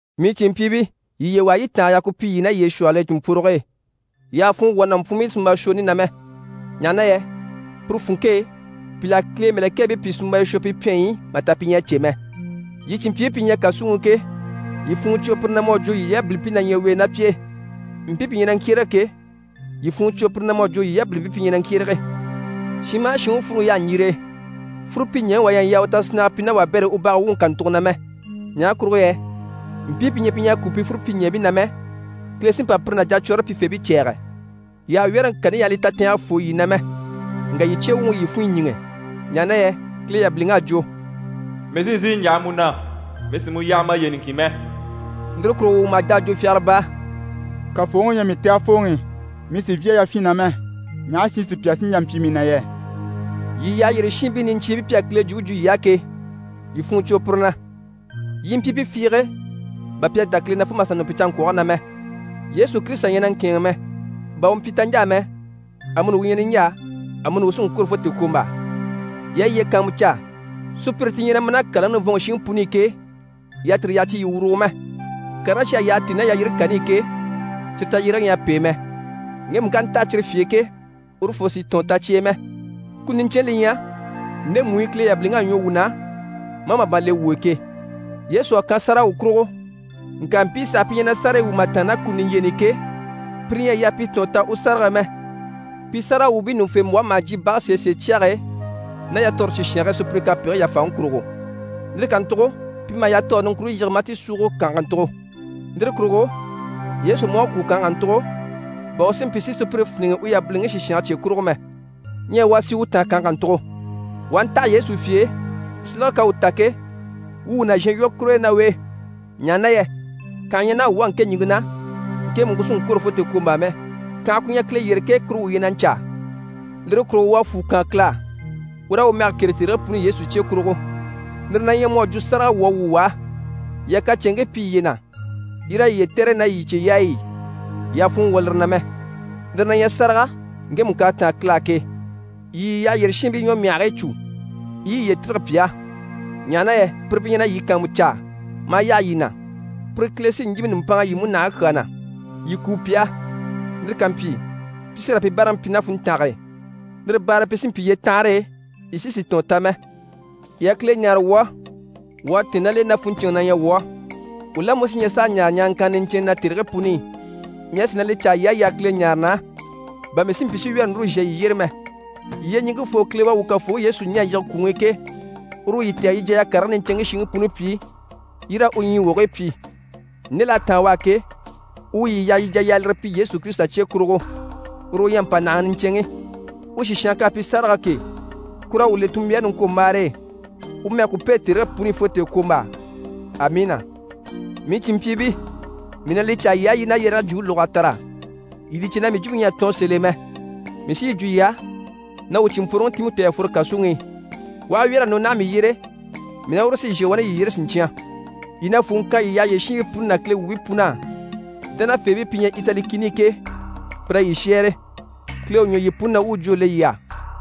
Mii cìnmpyiibii, yii yiye waha yii i tàange yaha ku pyi yii ná yiye shwɔhɔl'e cìnmpworoge e. Yii àha funŋɔ wwɔ̀ nàmpwuunbii sunmbashwooni na mɛ, ɲaha na yɛ puru funŋke e pìl'à Kile mɛ̀lɛkɛɛbii pìi sunmbaya shwɔ pi pyɛnyi i mà ta pi ɲyɛ a cè mɛ. Yii cìnmpyiibii pi ɲyɛ kàsuŋi i ke, yii funŋɔ cwo pire na mu à jwo yii yabilimpii na ɲyɛ u e ná pi e. Mpii pi ɲyɛ na ŋkyérege ke, yii funŋɔ cwo pire na mu à jwo yii yabilimpii pi ɲyɛ na ŋkyérege. Shin maha shin u fúruŋi yaha ɲjire e, fúrupyiɲɛɛŋi wà ɲyɛ a yaa u tasinnaga pyi ná wabɛr'e u bage wuŋi kàntugo na mɛ. Ɲaha kurugo yɛ mpii pi ɲyɛ pi ɲyɛ a kúu pi fúrupyiɲɛɛbii na mɛ, Kile sí n‑pa pire ná jacwɔɔre pyifeebii cɛ̂ɛgɛ. Yii àha wyɛ́rɛŋi kani yaha li tatɛɛngɛ fô yii na mɛ, ŋka yii cye wuŋi u yii funɲyi ɲíŋɛ. Ɲaha na yɛ Kile yabiliŋ'à jwo: «Mii sí n‑sìi n‑yaha mu na. Mii sì mu yaha maye niŋkin mɛ.» Lire kurugo wuu maha jà a jwo fyagara baa: «Kafooŋi u ɲyɛ mii tɛgɛfooŋi, mii sì n‑fyá yafyin na mɛ, ɲaha shi sùpya sí n‑jà n‑pyi mii na yɛ?» Yii yyaha yyére shiinbii niɲcyiibii pi à Kile jwumpe jwo yii á ke, yii funŋɔ cwo pire na, yii i mpyi pi fiige, bà pi à dá Kile na fo mà sà nɔ pi canŋkwɔge na mɛ. Yesu Kirisita ɲyɛ na ŋkɛ̂ɛnŋi mɛ: bà u mpyi taɲjaa mɛ, amuni u ɲyɛ niɲjaa, amuni u sí n‑kwôro fo tèekwombaa. Yii a yiye kàanmucaa, sùpyire ti ɲyɛ na ma ná kàlaŋi nivɔnŋi shiŋi puni i ke, yii àha tire yaha ti yii wurugo mɛ. Karigii cyi à yyaha tíi ná yalyire kani i ke, cyire tayyérege ɲyɛ a pêe mɛ. Ŋgemu ká ntaha cyire fye e ke, urufoo sì tɔ̀ɔn ta cyi e mɛ. Kuni niɲcɛnni li ɲyɛ ndemu i Kile yabiliŋ'à ɲwɔ wuu na maa màban le wuu e ke. Yesu à kan sáraga wuu kurugo, ŋka mpii saha pi ɲyɛ na sárayi wwû mà tàanna ná kuni niɲjyeeni i ke, pire ɲyɛ a yaa pi tɔ̀ɔn ta u sárage e mɛ. Pi sáragawwuubii ɲùŋufembwɔhe maha jyè bage sèesee cyage e ná yatɔɔre sìshange e sùpyire kapegigii yàfaŋi kurugo. Lire kàntugo pi maha yatɔɔre niŋkwure yige maa ti súugo kànhe kàntugo. Lire kurugo Yesu mú à kwû kànhe kàntugo, bà u si mpyi si sùpyire fíniŋɛ u yabiliŋi sìshange cye kurugo mɛ. Ɲyɛ wuu a sì u taan kànhe kàntugo, wuu taha Yesu fye e, silege k'à u ta ke, wuu wuu nàzhan lwɔ́ kur'e ná u e. Ɲaha na yɛ kànha ɲyɛ naha wuu á ŋke ɲìŋke na, ŋkemu ku sì n‑kwôro fo tèekwombaa mɛ. Kànhe ku ɲyɛ Kile yyére ke, kuru wuu ɲyɛ na ɲcaa. Lire kurugo wuu a fwù kaan Kile á, wuu raa u mɛge kêre tèrigii puni i Yesu cye kurugo. Lire na ɲyɛ mu à jwo sáraga wuu à wwû u á. Yii a kacɛnŋii pyi yiye na, yii raa yiye tɛ̀re ná yii cyeyaayi i. Yii àha funŋɔ wwɔ̀ lire na mɛ. Lire na ɲyɛ sáraga ŋkemu k'à táan Kile á ke. Yii yii yyaha yyére shiinbii ɲwɔmyahigii cû, yii i yiye tîrige pi á, ɲaha na yɛ pire pi ɲyɛ na yii kàanmucaa maa yaha yii na. Pire Kile sí n‑yíbe nùmpanŋa yii múnahigii kyaa na. Yii kúu pi á, lire ká mpyi, pi sí raa pi báaraŋi pyi ná funntange e. Lire baare e pi sí n‑pyi yyetanhare e, yii sí sì tɔ̀ɔn ta mɛ. Yii a Kile ɲáare wuu á. Wuu à tɛ̀ɛn ná l'e na funɲcɛnŋɛ na ɲyɛ wuu á. Wuu la mú si ɲyɛ s'a ɲaare ɲaaraŋkanna niɲcɛnnɛ na tèrigii puni i. Mii à sìi na li caa yii á, yii a Kile ɲáare na á, bà mii si mpyi si wyɛ̀rɛ núru zhà yii yyére mɛ. Yyeɲiŋkefoo Kile u à wuu Kafooŋi Yesu ɲɛ̀ a yige kwùŋi i ke, uru u yii tɛ̀gɛ yii jà yii a karigii niɲcɛnŋkii shiŋi puni pyi, yii raa u ɲyii wogigii pyi. Nde l'à táan u á ke, u yii yaha yii jà yii a lire pyi Yesu Kirisita cye kurugo. Uru u ɲyɛ mpànahaŋi niɲcɛnŋi. U sìshange k'à pyi sárage ke, kur'à wuu le tunmbyaare niŋkwombaare e. U mɛge ku pêe tèrigii puni i fo tèekwombaa! Amiina. Mii cìnmpyiibii, mii na li caa yii á, yii i na yɛrɛge jwumpe lóg'a tara. Yii li cè na mii jwumpe ɲyɛ a tɔɔn sèl'e mɛ. Mii sí yi jwo yii á na wuu cìnmpworoŋi Timɔti a fworo kàsuŋi i. U aha wyɛ̀r'a nɔ naha mii yyére, mii ná uru sí n‑shà wani yii yyére siɲcyan. Yii na fwùŋi kan yii yyaha yyére shiinbii puni ná Kile wuubii pun'á. Dánafeebii pi ɲyɛ Itali kìni i ke, pir'à yii shɛ́ɛre. Kile u ɲwɔ yii puni na, u u jwó le yii á!